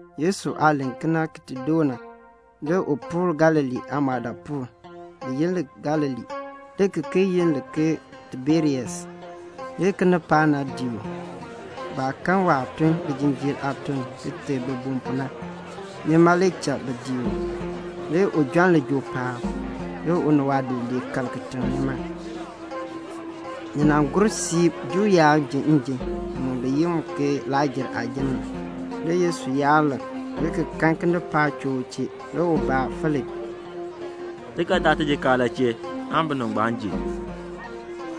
Yesu aah len kena ki ti doo na, le u puur Galilee aamɔɔdaapuul. Bi yi li Galilee, le ki ki yi li ke Tiberias. Le kinipaak nan dii u. Baah kan waah tun lijinjiir aatun ki teei bibum pu na, nima le cha bi dii u. Le u jon lijool paab, le u ni waadidiliib kal kitiŋ nima. Ni nan kpee siib Juu yaab ji njim, bi yi mu ke Lakr-jer aajim. Le Yesu yaar lik, le ki kan kinipaak choo u chee. Le u baa Filip, "Ti ga daa tijikaar la chee aan binib ngbaan ji?"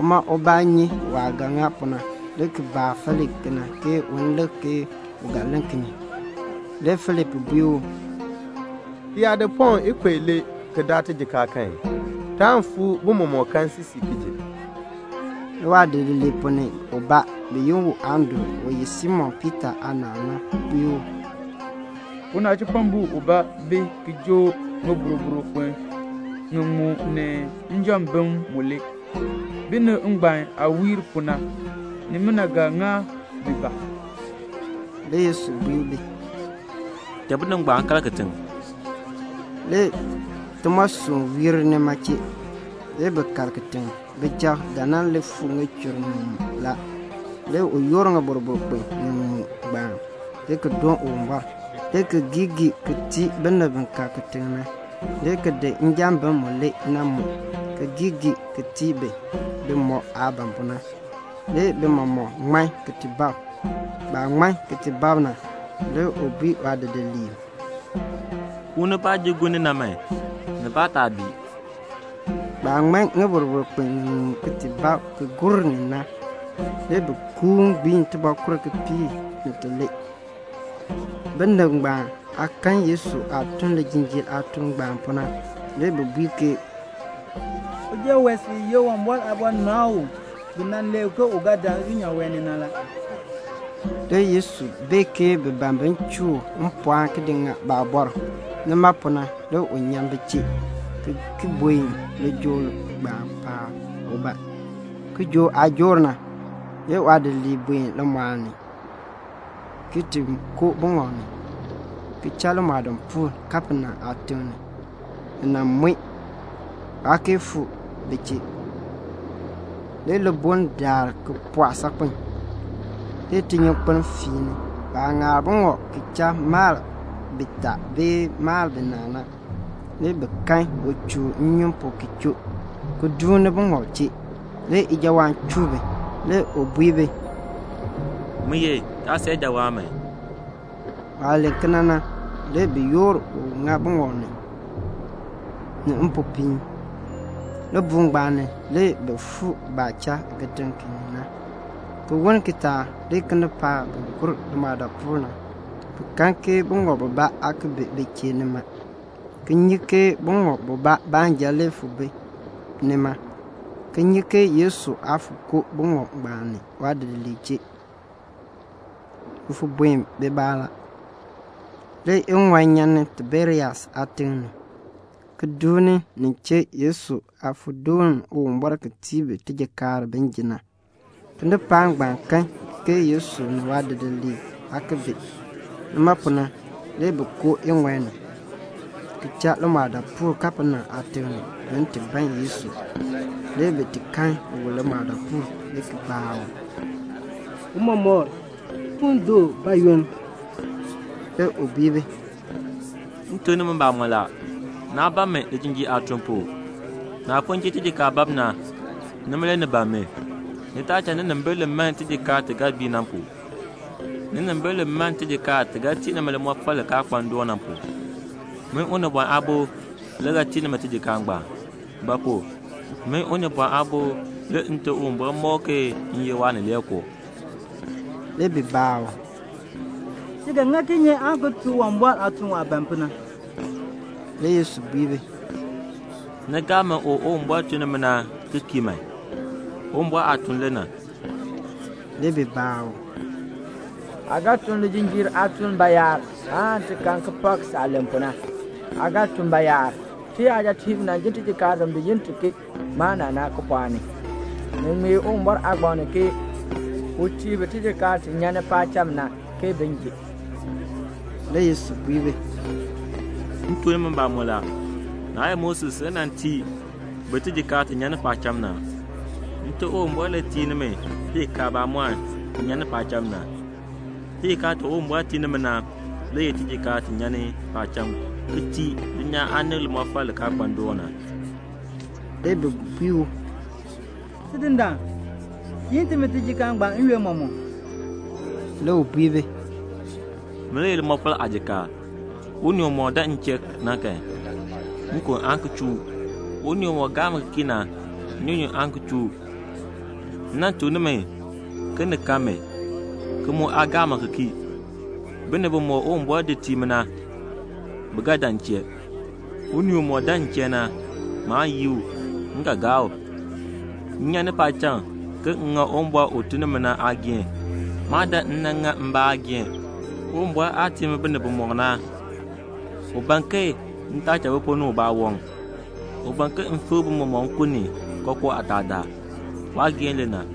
Uma ubaa nyi waah ga ŋa pu na, le ki baa Filip kena ke un lik ke u ga len kinye. Le Filip bui u, "Ti yaa di pɔŋ ikub ilee ki daa tijikaar kan, taan fuu bi mɔmɔk kan siisii ki ji." Le waadidiliib ponn ni ubaa, bi yi u Andru u ye Simon Piita aanaal na, bui u, "Unachipɔmbo ubaa bi ki joo ŋiboroboro kpin ŋiŋmu ni njambim mulee; binib ngbaan aah wiir pu na, nimina ga ŋa bi ba?" Le Yesu bui bi, "Cha binib ngbaan kal kitiŋ." Le timoosɔnn wiir nima chee. Le bi kal kitiŋ. Bijab ga nan li fuu ŋichur ŋiŋmu la. Le u yoor ŋiboroboro kpin ŋiŋmu ngbaan, le ki doon Uwumbɔr, le ki geei geei ki tii binib bi kal kitiŋ na, le ki di njambim mulee na mu, ki geei geei ki tii bi, bimɔk aah ban pu na. Le bi mɔmɔk ŋman ki ti bab. Baah ŋman ki ti bab na, le u bui waadidiliib, "Kuuni baah ji gur ni na man, nibaa taa bii." Baah ŋman ŋiboroboro kpin ŋiŋmu ki ti bab ki gur ni na, le bi kuuni gbiin tibɔɔkur kipiik ni tilee. Binib ngbaan aah kan Yesu aah tun lijinjiir aatuln ngbaan pu na, le bi bui ke, "Uja wee sil ye Uwumbɔr aabɔnabr u bi nan len ke u ga dan dulnyaa wee ni na la." Le Yesu bee ke bi ban bin chuu u mpɔɔn ki di ŋa baabɔr. Nima pu na le u nyan bi chee, ki ki buen lijool ngbaan paab ubaa. Kijook aah joor na, le waadidiliib buen limɔɔl ni, ki ti koo buŋɔb ni, ki cha limɔɔdaapuul, Kapenaum aatiŋ ni. Ni nan mue, waa kee fuu ni bi chee. Le libuln daar le ki pɔɔ saakpen, le tinyunkpeln feeni. Baah ŋaar buŋɔb ki cha mal bitaa bee mal binaa na, le bi kan u chuun nnyun pu ki choo, ki duuni baaŋɔb chee. Le ijawaan chuu bi. Le u bui bi, "Min ye. Taa san ijawaan man." Waah len kena na, le bi yoor u ŋa buŋɔb na ni, ni mpopiin. Libuul ngbaan ni le bi fuu baah cha kitiŋ ki ni na. Ki woln kitaak le kinipaak bi gur limɔɔdaapuul na, bi kan buŋɔb bubaa aa ki bi bi chee nima, ki nyi ke buŋɔb bubaa baanja le fon bi nima, ki nyi ke Yesu aa fon koo buŋɔb ngbaan ni waadidiliib chee, bi fon buen bibaa la. Le iŋɔi nyan ni Tiberias aatiŋ ni, ki duuni nin chee Yesu aah fon doon Uwumbɔr ki tii bi tijikaar bin ji na. Kinipaak ngbaan kan ke Yesu ni waadidiliib aa ki bi. Nima pu na le bi koo iŋɔi ni, ki cha limɔɔdaapuul Kapenaum aatiŋ ni, bin ti ban Yesu. Le bi ti kan u limɔɔdaapuul, le ki baa u, "Tiicha, aa fuu ni du bayoonn?" Le u bui bi, "M tuk nimi mbamɔn la, naa ban mi lijinjiir aatun pu. Naah fon ji tijikaar bab na, nima le ni ban mi. Ni taa cha ninimbil li man tijikaar ti ga bii na pu. Ninimbil li man tijikaar ti ga tii nimi limɔfal li kaa kpa ndoon na pu. Min Unibɔn Aabo le ga tii nimi tijikaar ngbaan; ba pu? min Unibɔn Aabo le Nte Uwumbɔr mɔk ke m ye Waanileekoo." Le bi baa u, "Ti ga ŋa kinye aan ki tun Uwumbɔr aatuln waah ban pu na?" Le Yesu bui bi, "Ni gaa mi u Uwumbɔr tun ni u na ki kii man. Uwumbɔr aatuln le na." Le bi baa u, "Aa ga tun lijinjiir aatuln bayaar, aan ti kan ki pak saah len pu na? Aa ga tun bayaar? Tiyajatiib nan ji tijikaar ti bi yi ti ke mana na, kipɔɔk ni; ni ŋmee Uwumbɔr aagbaŋ ni ke 'U tii bi tijikaar ti nyan ni paacham na, ke bin ji."' Le Yesu bui bi, "M tuk nimi mbamɔn la, naa ye Moses le nan tii bi tijikaar ti nyan ni paacham na. Nte Uwumbɔr le tii nimi tijikaar bamɔnn ti nyan ni paacham na. Tijikaar ti Uwumbɔr tii nimi na le ye tijikaar ti nyan ni paacham ki tii dulnyaa aanib limɔfal li kaa kpa ndoon na." Le bi bui u, "Tidindaan, tiin timi tijikaar ngbaan n-yoonn mɔmɔk." Le u bui bi, "Min le ye limɔfal aajikaar. Unii umɔk dan m chee na kan, nkon aan ki chuu u. Unii umɔk gaa mi ki kii na, nnyunyun aan ki chuu u. M nan tuk nimi ke ni kan mi, ki mu aa gaa mi ki kii. Binib bimɔk Uwumbɔr di tii mi na, bi ga dan m chee. Unii umɔk dan m chee na, maan yii u, m ga gaa u. M nyan ni paacham ke m ŋa Uwumbɔr u tun ni mi na aageehn. Maa dan m nan ŋa mbaa aageehn. Uwumbɔr aah tii mi binib bimɔk na, u ban ke m taa cha bi ponn ni ubaa waŋ. U ban ke m fikr bi mɔmɔk nkun ni kookoo aataadaal. Waageehn le na.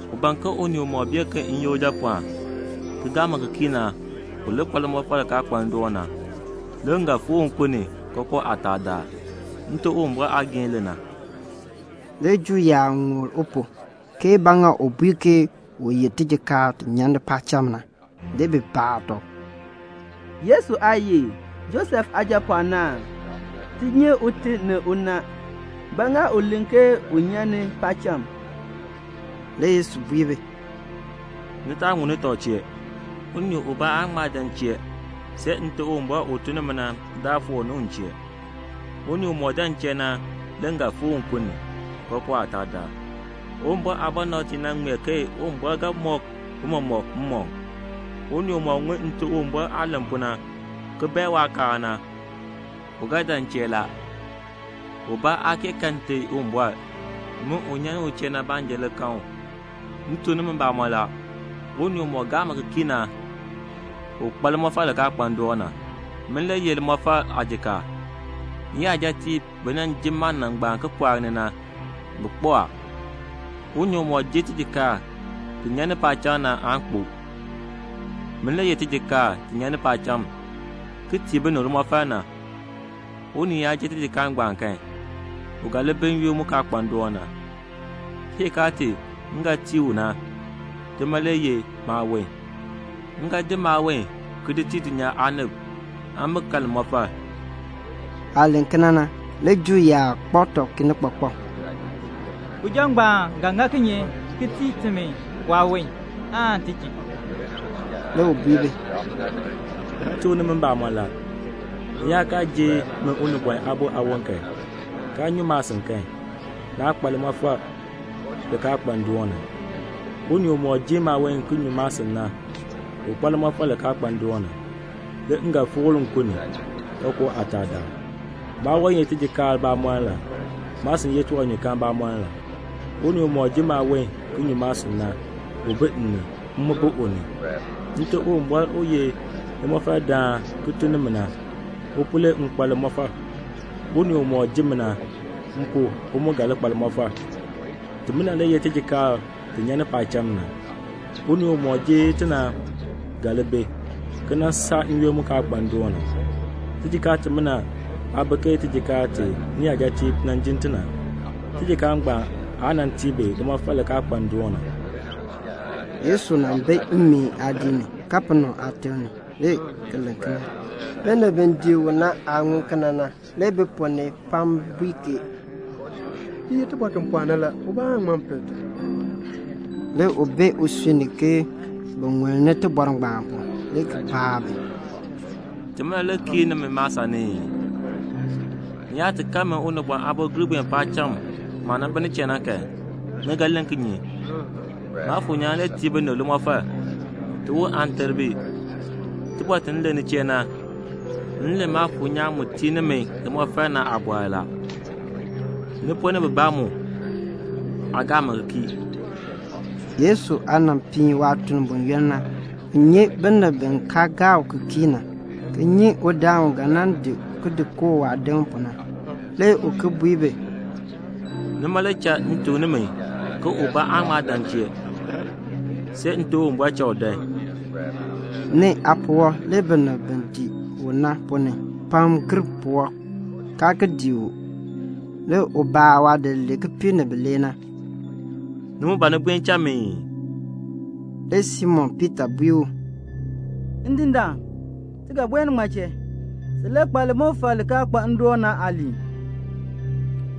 U ban ke unii umɔk bee ke m ye Ujapɔɔn, ki gaa mi ki kii na, u li kpa limɔfal li kaa kpa ndoon na. Le m ga fikr u nkun ni kookoo aataadaal. Nte Uwumbɔr aageehn le na." Le Juu yaab ŋul u pu, ke ba ŋa u bui ke u ye tijikaar ti nyan ni paacham na. Le bi baa tɔb, "Yesu aa ye ee? Josef aajapɔɔn aa? Ti nyi ute ni una. Ba ŋa u len ke u nyan ni paacham?" Le Yesu bui bi, "Ni taa ŋulni tɔb chee. Unii ubaa aan ŋma dan m chee see Nte Uwumbɔr u tun ni mi na daa foor ni u m chee. Unii umɔk dan m chee na le m ga fikr u nkun ni, kookoo aataadaal. Uwumbɔr aabɔnabtiib nan ŋmee ke Uwumbɔr ga mɔk bi mɔmɔk mmɔkm. Unii umɔk ŋun Nte Uwumbɔr aah len pu na, ki bae waakaal na, u ga dan m chee la. Ubaa aa kee kan Nte Uwumbɔr. Min u nyan ni u chee na baanja le kan u. "M tuk nimi mbamɔn la, unii umɔk gaa mi ki kii na, u kpa limɔfal li kaa kpa ndoon na. Min le ye limɔfal aajikaar. Niyajatiib bi nan ji mana ngbaan kipɔɔk ni na, bi kpo a. Unii umɔk ji tijikaar ti nyan ni paacham na aan kpo. Min le ye tijikaar ti nyan ni paacham ki tii binib limɔfal na. Unii yaa ji tijikaar ngbaan kan, u ga li bi n-yoonn mu kaa kpa ndoon na. Tijikaar ti m ga tii u na, tima le ye maawon. M ga di maawon ki di tii dulnyaa aanib, aan bi kan limɔfal." Waah len kena na, le Juu yaab kpak tɔb kinikpakpak, "Uja ngbaan ga ŋa kinye ki tii timi waawon, aan ti ji?" Le u bui bi, "M tuk nimi mbamɔn la, ni yaa kaa ji min Unibɔn Aabo aawon kan, kaa nyu maasin kan, naa kpa limɔfal li kaa kpa ndoon na. Unii umɔk ji maawon ki nyu maasin na, u kpa limɔfal li kaa kpa ndoon na, le m ga fikr u nkun ni, kookoo aataadaal. Maawon ye tijikaar bamɔnn la. Maasin ye tiwanyukaan bamɔnn la. Unii umɔk ji maawon ki nyu maasin na, u bi m ni, m mu bi u ni. Nte Uwumbɔr u ye limɔfaldaan ki tun ni mi na, u pu le m kpa limɔfal. Unii umɔk ji mi na, m pu u mu ga li kpa limɔfal. Timina le ye tijikaar ti nyan ni paacham na. Unii umɔk ji ti na ga li bi, ki nan saa n-yoonn mu kaa kpa ndoon na. Tijikaar timina aa bi ke tijikaar ti niyajatiib nan jin ti na; tijikaar ngbaan aa nan tii bi limɔfal li kaa kpa ndoon na." Yesu nan bi mmeen aadiik ni, Kapenaum aatiŋ ni, le ki len kena. Binib bi dii u na aah ŋun kena na, le bi ponn ni pam bui ke, "Ti ye tibɔr ti pɔɔ na la. Ubaa aa ŋma pel ti." Le u bee usui ni ke bi ŋulni tibɔr ngbaan pu, le ki baa bi, "Timina le kiir nimi maasan ni ii? Ni yaa ti kan min Unibɔn Aabo gir buen paacham maah nan bi nin chee na kan, ni ga len kinye? Maafuur nyaan le tii binib limɔfal. Tiwon aan ter bi. Tibɔr ti m len ni chee na, m len Maafuur nyaan mu tii nimi limɔfal na aabɔr la. Ni ponn ni bibaa mu aa gaa mi ki kii." (Yesu aah nan piin waatuln buyoonn na, u nyi binib bi kaa gaa u ki kii na, ki nyi udaan u ga nan di u di kooh waadim pu na.) Le u ki bui bi, "Nima le cha m tuk nimi ke ubaa aa ŋma dan m chee, see Nte Uwumbɔr cha u dan." Nee aapuwɔb le binib bi dii u na ponn ni pam gir puwɔb kaa ki dii u. Le u baa waadidiliib kipiik ni bilee na, "Ni mu ban ni buen cha mi ii?" Le Simon Piita bui u, "Ndindaan, ti ga buen ŋmaa chee? Sin le kpa limɔfal li kaa kpa ndoon na aaliin.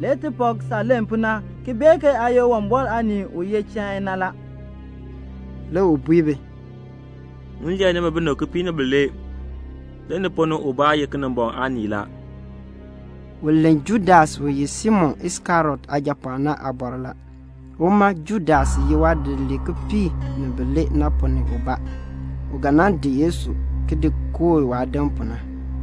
Le ti pak saah len pu na ki bee ke aa ye Uwumbɔr Aanii u ye Chain na la." Le u bui bi, "M lee nimi binib kipiik ni bilee. Le ni ponn ni ubaa ye Kinimbɔŋ aanii la." U len Judas u ye Simon Iskariot aajapɔɔn na aabɔr la; uma Judas ye waadidiliib kipiik ni bilee na ponn ni ubaa, u ga nan di Yesu ki di kooh waadim pu na.